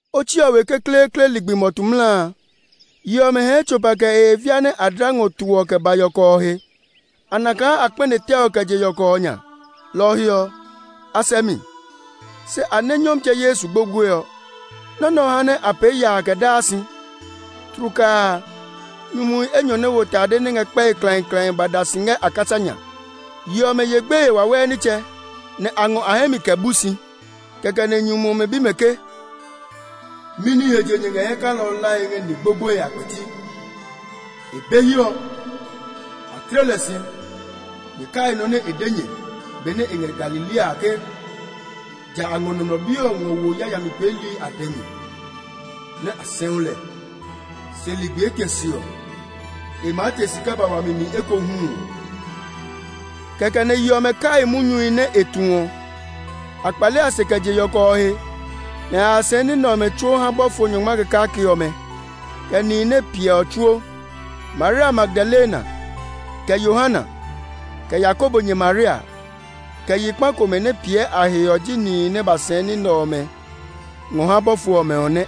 Otsi ɔ we kekleekle ligbi mɔtu mla a, yi ɔmɛ hɛɛ tsopa kɛ e he via nɛ a dla ngɔ to ɔ kɛ ba yɔkɔ ɔ he. A na kaa a kpɛne tɛ ɔ kɛ je yɔkɔ ɔ nya. Lɔ ɔ he ɔ, a sɛ mi; se a nɛ Nyɔmtsɛ Yesu gbogboe ɔ. Nɔ́ nɛ ɔ ha nɛ a pee yaa kɛ daa si. Tlukaa a, nyumuhi enyɔ nɛ wo tade nɛ ngɛ kpɛe klãiklãi ba da si ngɛ a kasa nya. Yi ɔmɛ ye gbeye wawɛɛ nitsɛ, nɛ a ngɔ a hɛ mi kɛ bu si. Kɛkɛ nɛ nyumu ɔmɛ bi mɛ ke, “Mɛni he je nyɛ ngɛ hɛ kalɔ ɔ hlae ngɛ ni gbogboehi a kpɛti? [ E be hiɛ ɔ; a tle lɛ si.] Nyɛ kai nɔ́ nɛ e de nyɛ benɛ e ngɛ Galilea a ke ‘Ja a ngɔ Nɔmlɔ Bi ɔ ngɔ wo yayami peeli a dɛ mi, nɛ a sɛu lɛ; se ligbi etɛ se ɔ, e maa te si kɛ ba wami mi ekohu’ ɔ.” Kɛkɛ nɛ yi ɔmɛ kai munyuhi nɛ e tu ɔ. A kpale a se kɛ je yɔkɔ ɔ he, nɛ a ya sɛɛ ní nɛ ɔmɛ tsuo ha bɔfo nyɔngma kɛ kake ɔmɛ, kɛ nihi nɛ piɛ ɔ tsuo. Maria Magdalena, kɛ Yohana, kɛ Yakobo nyɛ Maria, kɛ yi kpa komɛ nɛ piɛ a he ɔ ji nihi nɛ ba sɛɛ ní nɛ ɔmɛ ngɔ ha bɔfo ɔmɛ ɔ nɛ.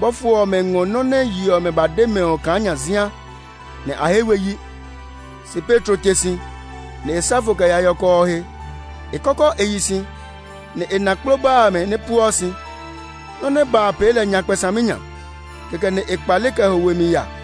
Bɔfo ɔmɛ ngɔ nɔ́ nɛ yi ɔmɛ ba de mɛ ɔ kaa nyazia, nɛ a he we yi. [ Se Petro te si, nɛ e sa fo kɛ ya yɔkɔ ɔ he. E kɔkɔ e yi si, nɛ e na kploba amɛ nɛ pueɔ si. Nɔ́ nɛ ba a pee lɛ nyakpɛ saminya; kɛkɛ nɛ e kpale kɛ ho we mi ya.]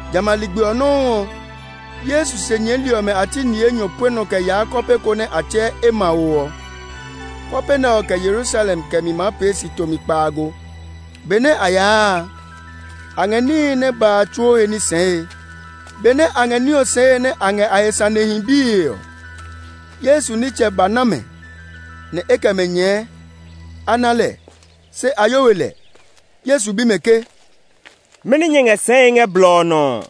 Jamɛ a ligbi ɔ nɔuu ɔ, Yesu se nyɛɛli ɔmɛ a ti ni enyɔ pue nɔ kɛ yaa kɔpe ko nɛ a tsɛɛ Emao ɔ. Kɔpe nɛ ɔ kɛ Yerusalem kɛmi maa pee si tomi kpaago. Benɛ a yaa a, a ngɛ níhi nɛ ba a tsuo a he ní sɛɛe. Benɛ a ngɛ ní ɔ sɛɛe nɛ a ngɛ a he sanehi bie ɔ, Yesu nitsɛ ba na mɛ, nɛ e kɛ mɛ nyɛɛ. A na lɛ, se a yo we lɛ. Yesu bi mɛ ke, “Mɛni nyɛ ngɛ sɛɛe ngɛ blɔ ɔ nɔ ɔ?”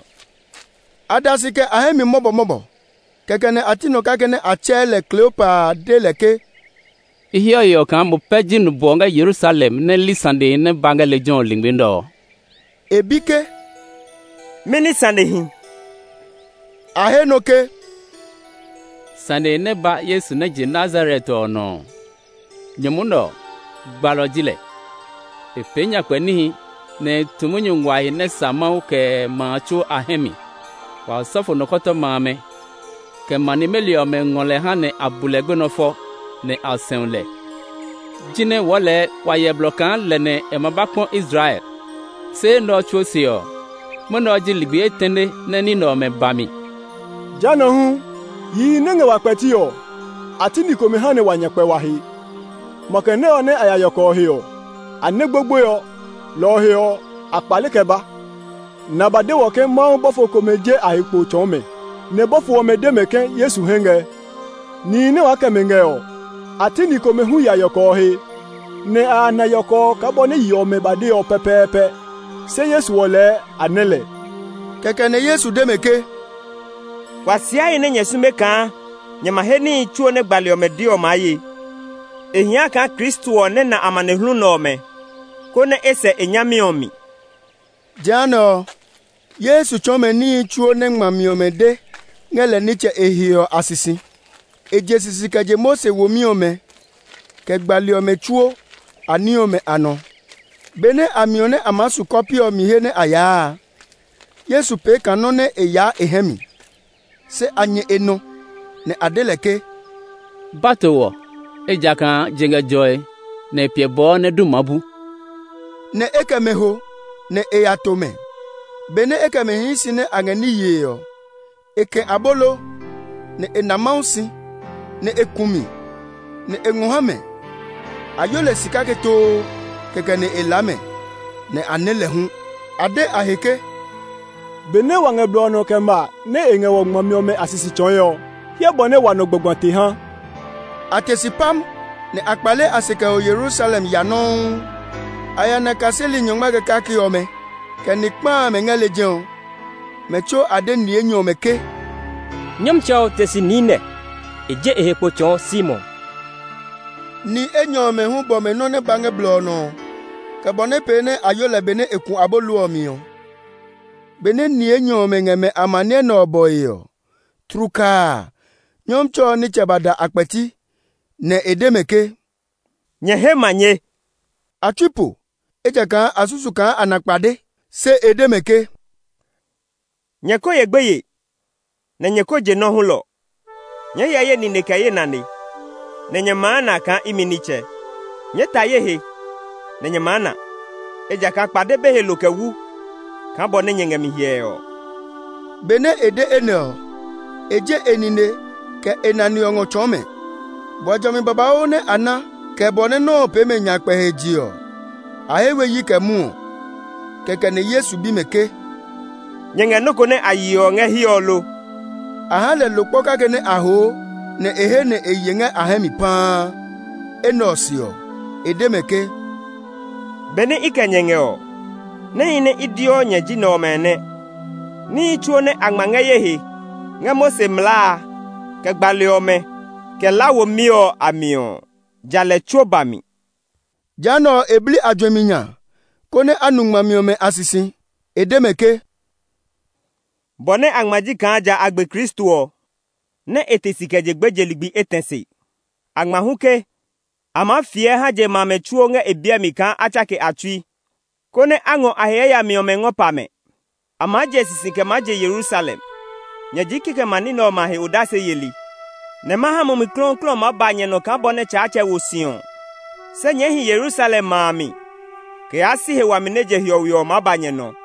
A da si kɛ a hɛ mi mɔbɔmɔbɔ. Kɛkɛ nɛ a ti nɔ kake nɛ a tsɛɛ lɛ Kleopa a de lɛ ke, “I heɔ yeɔ kaa mo pɛ ji nubwɔ ngɛ Yerusalem nɛ li sanehi nɛ ba lejɛ ɔ lingmi nɛ ɔ!” E bi ke, “Mɛni sanehi?” A he nɔ ke, “Sanehi nɛ ba Yesu nɛ je Nazaret ɔ nɔ ɔ! Nyumu nɛ ɔ, gbalɔ ji lɛ. E pee nyakpɛ níhi, nɛ e tu munyu nguahi nɛ sa Mawu, kɛ ma a tsuo a hɛ mi. Wa osɔfo nikɔtɔma amɛ, kɛ ma nimeli ɔmɛ ngɔ lɛ ha nɛ a bu lɛ gbenɔ fɔ, nɛ a sɛu lɛ. Jinɛ wɔɔ lɛɛ wa hyɛ blɔ kaa lɛ nɛ e ma ba kpɔ Israel! Se enɛ ɔ tsuo se ɔ, mwɔnɛ ɔ ji ligbi etɛne nɛ ní nɛ ɔmɛ ba mi. Jehanɛ ɔ hu, yihi nɛ ngɛ wa kpɛti ɔ, a ti ni komɛ ha nɛ wa nya kpɛ wa he. Makɛ nɛ ɔ nɛ a ya yɔkɔ ɔ he ɔ, a nɛ gbogboe ɔ. Lɔ ɔ he ɔ, a kpale kɛ ba, nɛ a ba de wɔ ke Mawu bɔfo komɛ je a he kpo tsɔɔ mɛ, nɛ bɔfo ɔmɛ de mɛ ke Yesu hɛ ngɛ. Nihi nɛ waa kɛ mɛ ngɛ ɔ, a ti ni komɛ hu ya yɔkɔ ɔ he, nɛ a ya na yɔkɔ ɔ kaa bɔ nɛ yi ɔmɛ ba de ɔ pɛpɛɛpɛ. Se Yesu ɔ lɛɛ a nɛ lɛ.” Kɛkɛ nɛ Yesu de mɛ ke, “Kuasiahi nɛ nyɛ sume kaa nyɛ ma he níhi tsuo nɛ gbali ɔmɛ de ɔ maa ye! E hia kaa Kristo ɔ nɛ na amanehlu nɛ ɔmɛ, konɛ e sɛ e nyami ɔ mi.” Jehanɛ ɔ, Yesu tsɔɔ mɛ níhi tsuo nɛ ngmami ɔmɛ de ngɛ lɛ nitsɛ e he ɔ a sisi; e je sisi kɛ je Mose womi ɔmɛ, kɛ gbali ɔmɛ tsuo a ni ɔmɛ a nɔ. Benɛ a miɔ nɛ a maa su kɔpe mi he nɛ a yaa a, Yesu pee kaa nɔ́ nɛ e yaa e hɛ mi. Se a nyɛ e nɔ, nɛ a de lɛ ke, “Ba to wɔ; ejakaa je ngɛ jɔe, nɛ e piɛ bɔɔ nɛ du ma bu.” Nɛ e kɛ mɛ ho, nɛ e ya to mɛ. Benɛ e kɛ mɛ hii si nɛ a ngɛ ní yee ɔ, e kɛ̃ abolo, nɛ e na Mawu si, nɛ e ku mi, nɛ e ngɔ ha mɛ. A yo lɛ si kake too; kɛkɛ nɛ e laa mɛ, nɛ a nɛ lɛ hu. A de a he ke, “Benɛ wa ngɛ blɔ ɔ nɔ kɛ ma nɛ e ngɛ wɔ ngmami ɔmɛ a sisi tsɔɔe ɔ, hyɛ bɔ nɛ wa nɔ gbagba te ha!” A te si pam, nɛ a kpale a se kɛ ho Yerusalem ya nɔuu. A ya na kaseli nyɔngma kɛ kake ɔmɛ, kɛ ni kpa amɛ ngɛ lejɛ ɔ. Mɛ tsuo a de ni enyɔ ɔmɛ ke, “Nyɔmtsɛ ɔ te si niinɛ! E je e he kpo tsɔɔ Simon!” Ni enyɔ ɔmɛ hu bɔ mɛ nɔ́ nɛ ba ngɛ blɔ ɔ nɔ, kɛ bɔ nɛ pee nɛ a yo lɛ benɛ e ku abolo ɔ mi ɔ. Benɛ ni enyɔ ɔmɛ ngɛ mɛ amaniɛ nɛ ɔ bɔe ɔ, tlukaa a, Nyɔmtsɛ ɔ nitsɛ ba da a kpɛti, [nɛ e de mɛ ke, “Nyɛ he manye.”] A tsui po, ejakaa a susu kaa a na kpade. Se e de mɛ ke, “Nyɛ ko ye gbeye, nɛ nyɛ ko je nɔ́ hulɔ! Nyɛɛ hyɛ ye nine kɛ ye nane, nɛ nyɛ maa na kaa imi nitsɛ. Nyɛɛ ta ye he, nɛ nyɛ maa na; ejakaa kpade be he lo kɛ wu kaa bɔ nɛ nyɛ ngɛ mi hyɛe ɔ.” [ Benɛ e de enɛ ɔ, e je e nine, kɛ e nane ɔ ngɔ tsɔɔ mɛ.] Bua jɔmi babauu nɛ a na, kɛ bɔ nɛ nɔ́ ɔ pee mɛ nyakpɛ he je ɔ, a he we yi kɛ mwɔɔ. Kɛkɛ nɛ Yesu bi mɛ ke, “Nyɛ ngɛ nɔ́ ko nɛ a yeɔ ngɛ hiɛ ɔ lo?” A ha lɛ lo kpɔ kake nɛ a hoo, nɛ e he nɛ e ye ngɛ a hɛ mi paa. Enɛ ɔ se ɔ, e de mɛ ke, “Benɛ i kɛ nyɛ ngɛ ɔ, níhi nɛ i deɔ nyɛ ji nɛ ɔmɛ nɛ: níhi tsuo nɛ a ngma ngɛ ye he ngɛ Mose mlaa a, kɛ gbali ɔmɛ, kɛ La womi ɔ a mi ɔ, ja lɛ tsuo ba mi.” Jehanɛ ɔ, e bli a juɛmi nya, konɛ a nu ngmami ɔmɛ a sisi. E de mɛ ke, “Bɔ nɛ a ngma ji kaa ja a gbe Kristo ɔ, nɛ e te si kɛ je gbeje ligbi etɛ se. A ngma hu ke, a maa fiɛ ha je ma amɛ tsuo ngɛ e biɛ mi kaa a tsake a tsui, konɛ a ngɔ a he yayami ɔmɛ ngɔ pa mɛ. A maa je sisi kɛ je Yerusalem. Nyɛ ji kikɛmɛ a ní nɛ ɔmɛ a he odase yeli, nɛ ma ha Mumi Klɔuklɔu ɔ maa ba nyɛ nɔ kaa bɔ nɛ Tsaatsɛ wo si ɔ. Se nyɛɛ hi Yerusalem ma a mi kɛ yaa si he wami nɛ je hiɔwe ɔ maa ba nyɛ nɔ.”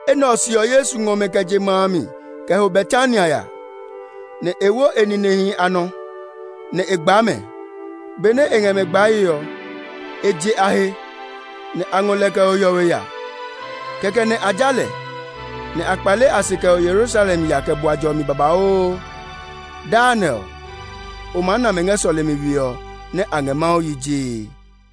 Enɛ ɔ se ɔ, Yesu ngɔ mɛ kɛ je ma a mi kɛ ho Betania ya; nɛ e wo e ninehi a nɔ, nɛ e gbaa mɛ. Benɛ e ngɛ mɛ gbae ɔ, e je a he, [nɛ a ngɔ lɛ kɛ ho hiɔwe ya. Kɛkɛ nɛ a ja lɛ,] nɛ a kpale a se kɛ ho Yerusalem ya kɛ bua jɔmi babauu. Daa nɛ ɔ, o maa na mɛ ngɛ sɔlemi we ɔ nɛ a ngɛ Mawu yi jee.